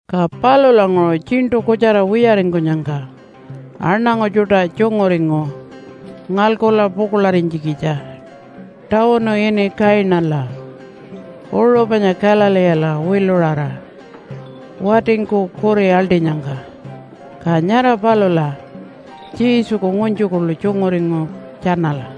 Ka palulanguṟu tjiṉṯu kutjara wiyaringkunyangka aṉangu tjuṯa tjunguringu ngalkula pukuḻarinytjikitja tawunu ini Kainala uṟu panya Galileela wiluṟara watingku kuri aḻṯinyangka. Ka nyara palula Jesuku ngunytju kuḻu tjunguringu tjanala.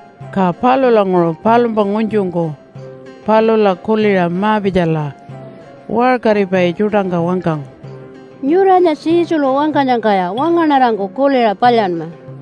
Ka palulanguṟu palumpa ngunytjungku palula kuliṟa ma-pitjala waṟkaripai tjuṯangka wangkangu, “Nyuranya Jesulu wangkanyangkaya wangaṉarangku kuliṟa palyanma.”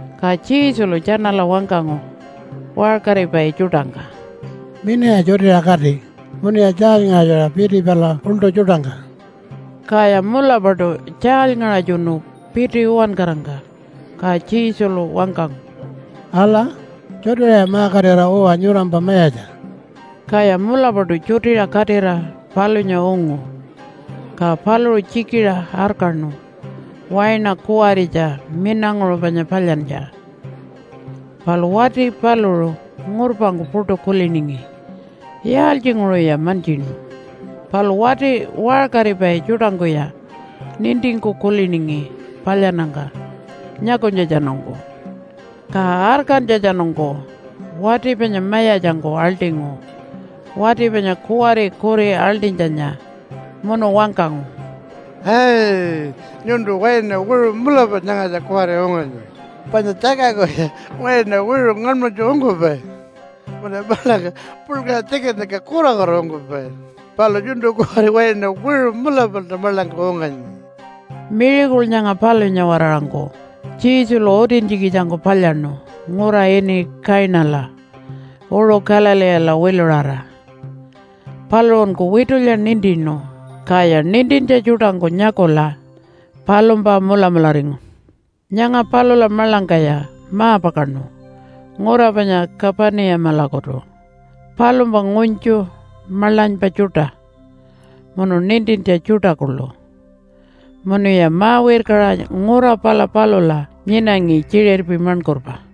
Ka Jesulu tjanala wangkangu waṟkaripai tjuṯangka, “Minaya tjutiṟa kati munuya tjaalyngaṟatjura piti pala uḻṯu tjuṯangka.” Kaya mulapaṯu tjaalyngaṟatjunu piti uwankarangka. Ka Jesulu wangkangu, “Ala, tjutiṟaya ma-katira uwa nyurampa mayatja.” Kaya mulapaṯu tjutiṟa katira palunya ungu. Ka paluṟu tjikiṟa arkaṉu waina kuwaritja minanguṟu panya palyantja, palu wati paluṟu ngurpangku puṯu kuliningi yaaltjinguṟuya mantjinu. Palu wati waṟkaripai tjuṯangkuya nintingku kuliningi palyannyangka nyakunytjatjanungku. Ka arkantjatjanungku wati panya mayatjangku aḻṯingu wati panya kuwari kuri aḻṯinytjanya. Munu wangkangu, “Ai, nyuntu waina wiṟu mulapa nyangatja kuwari unganyi, panya tjakangkuya waina wiṟu ngaṉmanytju ungkupai munuya maḻangka puḻkaṟa tjikinnyangka kurakura ungkupai. Palu nyuntu kuwari waina wiṟu mulapalta maḻangka unganyi.” Miracle nyanga palunya-waraṟangku Jesulu utintjikitjangku palyaṉu ngura ini Kainala uṟu Galileela wiluṟara. Paluṟunku witulya nintinu, kaya nintintja tjuṯangku nyakula palumpa mulamularingu. Nyanga palula maḻangkaya ma-pakaṉu ngura panya Kapunimalakutu palumpa ngunytju, maḻanypa tjuṯa, munu nintintja tjuṯa kuḻu, munuya ma-wirkaṟa ngura pala palula nyinangi tjiṟirpi maṉkurpa.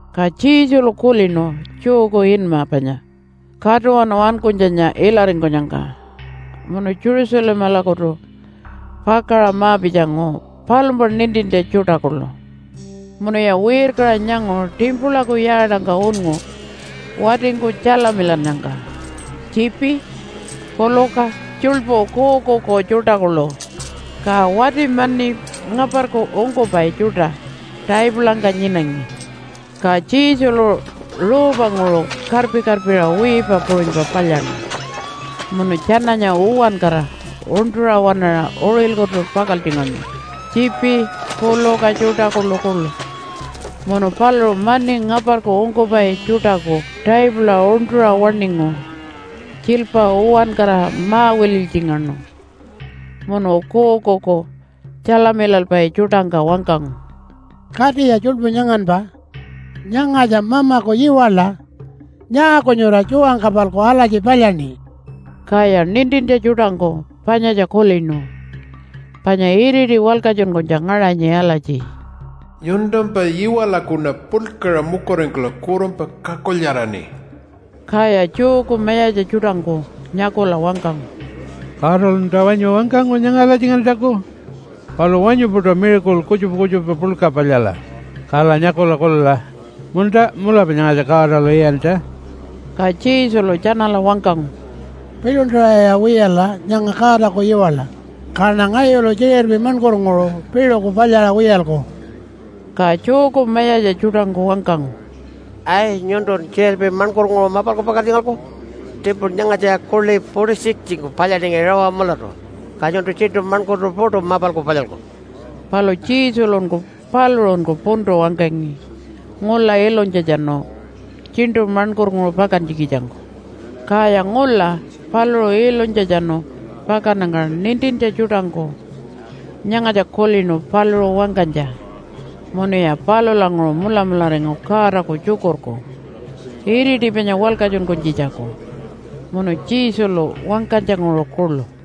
Ka Jesulu kulinu Jewku inma panya Katuwanu Ankunytjanya ilaringkunyangka, munu Jerusalemalakutu pakaṟa ma-pitjangu palumpa nintintja tjuṯa kuḻu. Munuya wirkaṟa nyangu timpulaku yaatangka unngu watingku tjalamilannyangka tjiipi, puluka, tjuḻpu kuukuuku tjuṯa kuḻu. Ka wati mani ngaparku ungkupai tjuṯa taipulangka nyinangi. Ka Jesulu ruupanguṟu karpi-karpiṟa wiipa puṟunypa palyaṉu munu tjananya uwankara uṉṯuṟa waṉaṟa uṟilkutu pakaltjingaṉu tjiipi, puluka tjuṯa kuḻukuḻu. Munu paluṟu mani ngaparku ungkupai tjuṯaku taipula uṉṯuṟa waṉingu tjiilpa uwankara ma-wililytjingaṉu. Munu kuukuuku tjalamilalpai tjuṯangka wangkangu, “Katiya tjuḻpu nyanganpa. Nyangatja Mamaku yiwaḻa. Nyaaku nyura tjuwangka-palku alatji palyaṉi?” Kaya nintintja tjuṯangku panyatja kulinu, panya iriti walkatjunkunytja ngaṟanyi alatji, “Nyuntumpa yiwaḻakuṉa puḻkaṟa mukuringkula kurunpa kakulyaraṉi.” Kaya Jewku mayatja tjuṯangku nyakula wangkangu, “Godalunta wanyu wangkangu nyanga alatjingantjaku? Palu wanyu-puṯa miracle kutjupa kutjupa puḻka palyala, kala nyakula kulila, ‘Munta, mulapa nyangatja Godalu iyantja.’” Ka Jesulu tjanala wangkangu, “Piḻuntaṟaya wiyala nyanga Godaku yiwaḻa, kaṉa ngayulu tjiṟirpi maṉkurnguṟu piṟuku palyaṟa wiyalku.” Ka Jewku mayatja tjuṯangku wangkangu, “Ai, nyuntun tjiṟirpi maṉkurnguṟu mapalku pakaltjingalku? Timpula nyangatjaya kuḻi 46-ngku palyaningi rawa mulatu, ka nyuntu tjiṉṯu maṉkurtu puṯu mapalku palyalku.” Palu Jesulunku paluṟunku puntu wangkangi ngula ilunytjatjanu tjiṉṯu maṉkurnguṟu pakantjikitjangku. Kaya ngula paluṟu ilunytjatjanu pakannyangka nintintja tjuṯangku nyangatja kulinu paluṟu wangkanytja munuya palulanguṟu mulamularingu Godaku Tjukurku iriti panya walkatjunkunytjitjaku, munu Jesulu wangkanytjanguṟu kuḻu.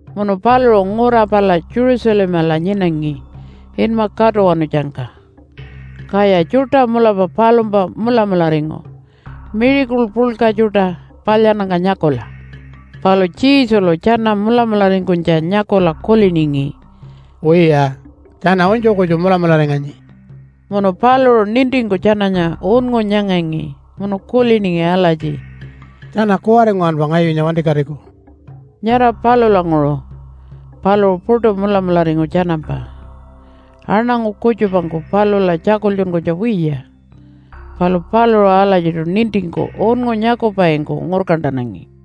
Munu paluṟu ngura pala Jerusalemala nyinangi inma Katuwanutjangka, kaya tjuṯa mulapa palumpa mulamularingu miracle puḻka tjuṯa palyannyangka nyakula. Palu Jesulu tjana mulamularingkunytja nyakula kuliningi, “Wiya, tjana unytju kutju mulamularinganyi.” Munu paluṟu nintingku tjananya unngu nyangangi munu kuliningi alatji, “Tjana kuwari nguwanpa ngayunya wantikatiku.” Nyara palulanguṟu paluṟu puṯu mulamularingu tjanampa. Aṉangu kutjupangku palula tjakultjunkunytja wiya, palu paluṟu alatjiṯu nintingku unngu nyakupaingku ngurkantanangi.